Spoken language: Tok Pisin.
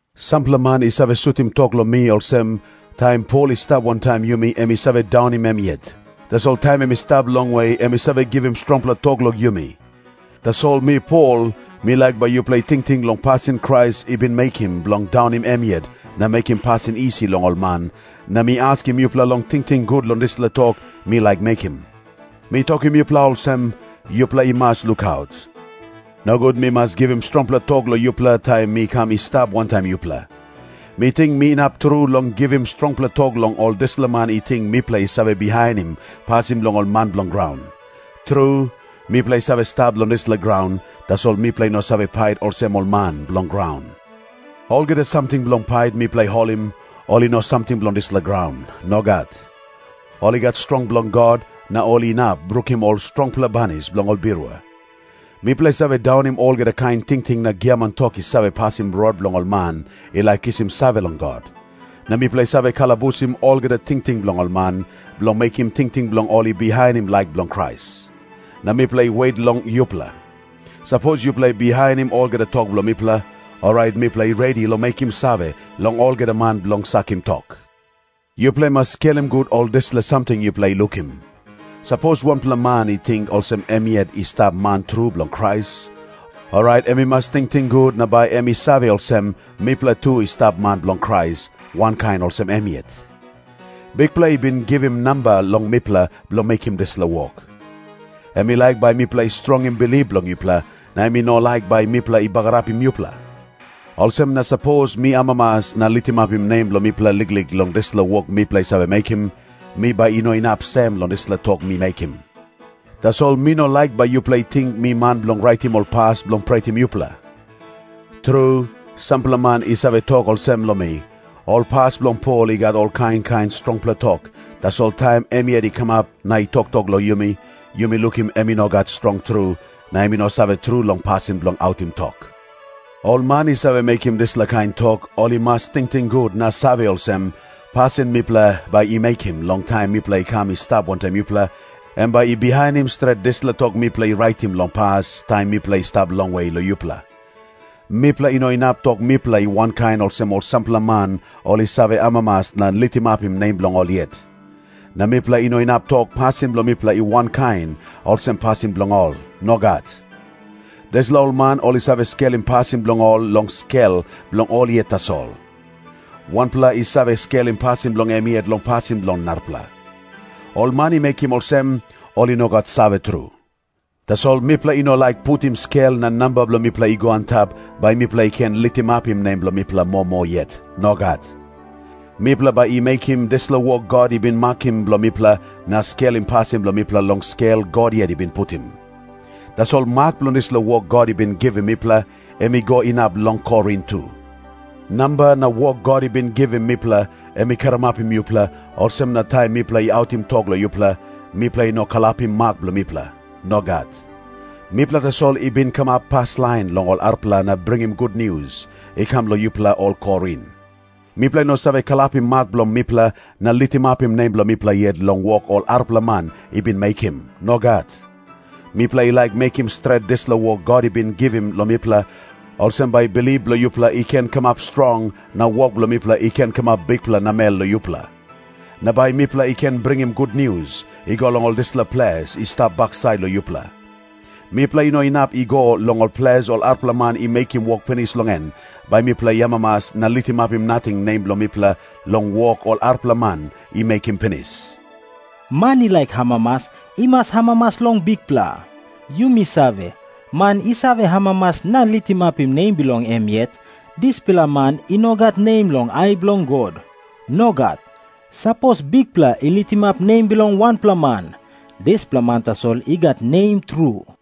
Sampela man i save sutim tok long mi olsem, "Taim Pol i stap wantaim yumi em i save daunim em yet, tasol taim em i stap longwe em i save givim strongpela tok long yumi." Tasol mi Pol, mi laik bai yupela i tingting long pasin Krais i bin mekim bilong daunim em yet na mekim pasin isi long ol man, na mi askim yupela long tingting gut long dispela tok mi laik mekim. Mi tokim yupela olsem, yupela i mas lukaut, nogut mi mas givim strongpela tok long yupela taim mi kam i stap wantaim yupela. Mi ting mi inap tru long givim strongpela tok long ol dispela man i ting mipela i save bihainim pasin bilong ol man bilong graun. Tru, mipela i save stap long dispela graun, tasol mipela i no save pait olsem ol man bilong graun. Olgeta samting bilong pait mipela i holim, ol i no samting bilong dispela graun. Nogat. Ol i gat strong bilong God, na ol inap brukim ol strongpela banis bilong ol birua. Mipela i save daunim olgeta kain tingting na giaman tok i save pasim rot bilong ol man i laik kisim save long God. Na mipela i save kalabusim olgeta tingting bilong ol man, bilong mekim tingting bilong ol i bihainim laik bilong Krais. Na mipela i wet long yupela. Sapos yupela i bihainim olgeta tok bilong mipela, orait mipela i redi long mekim save long olgeta man bilong sakim tok. Yupela i mas skelim gut ol dispela samting yupela i lukim. Sapos wanpela man i ting olsem em yet i stap man tru bilong Krais, orait em i mas tingting gut na bai em i save olsem, mipela tu i stap man bilong Krais, wankain olsem em yet. Bikpela i bin givim namba long mipela bilong mekim dispela wok. Em i laik bai mipela i strongim bilip bilong yupela, na em i no laik bai mipela i bagarapim yupela. Olsem na sapos mi amamas na litimapim nem bilong mipela liklik long dispela wok mipela i save mekim, mi bai i no inap sem long dispela tok mi mekim. Tasol mi no laik bai yupela i ting mi man bilong raitim ol pas bilong pretim yupela. Tru, sampela man i save tok olsem long mi, "Ol pas bilong Pol i gat ol kain kain strongpela tok, tasol taim em yet i kamap na i toktok long yumi, yumi lukim em i no gat strong tru, na em i no save tru long pasin bilong autim tok." Ol man i save mekim dispela kain tok, ol i mas tingting gut na save olsem, pasin mipela bai i mekim long taim mipela i kam i stap wantaim yupela, em bai i bihainim stret dispela tok mipela i raitim long pas long taim mipela i stap longwe long yupela. Mipela i no inap tok mipela i wankain olsem ol sampela man ol i save amamas na litimapim nem bilong ol yet. Na mipela i no inap tok, pasin bilong mipela i wankain olsem pasin bilong ol. Nogat. Dispela ol man ol i save skelim pasin bilong ol long skel bilong ol yet tasol. Wanpela i save skelim pasin bilong em yet long pasin bilong narapela. Ol man i mekim olsem, ol i no gat save tru. Tasol mipela i no laik putim skel na namba bilong mipela i go antap, bai mipela i ken litimapim nem bilong mipela moa moa yet. Nogat. Mipela bai i mekim dispela wok God i bin makim bilong mipela, na skelim pasin bilong mipela long skel God yet i bin putim. Tasol mak bilong dispela wok God i bin givim mipela, em i go inap long Korin tu. Namba na wok God i bin givim mipela, em i karamapim yupela, olsem na taim mipela i autim tok long yupela, mipela i no kalapim mak bilong mipela. Nogat. Mipela tasol i bin kamap paslain long ol arapela na bringim gutnius i kam long yupela ol Korin. Mipela i no save kalapim mak bilong mipela na litimapim nem bilong mipela yet long wok ol arapela man i bin mekim. Nogat. Mipela i laik mekim stret dispela wok God i bin givim long mipela, olsem bai bilip bilong yupela i ken kamap strong, na wok bilong mipela i ken kamap bikpela namel long yupela. Na bai mipela i ken bringim gutnius i go long ol dispela ples i stap baksait long yupela. Mipela i no inap i go long ol ples ol arapela man i mekim wok pinis long en, bai mipela i amamas na litimapim nating nem bilong mipela long wok ol arapela man i mekim pinis. "Man i laik amamas, em i mas amamas long Bikpela." Yumi save, man i save amamas na litimapim nem bilong em yet, dispela man i no gat nem long ai bilong God. Nogat. Sapos Bikpela i litimapim nem bilong wanpela man, dispela man tasol i gat nem tru.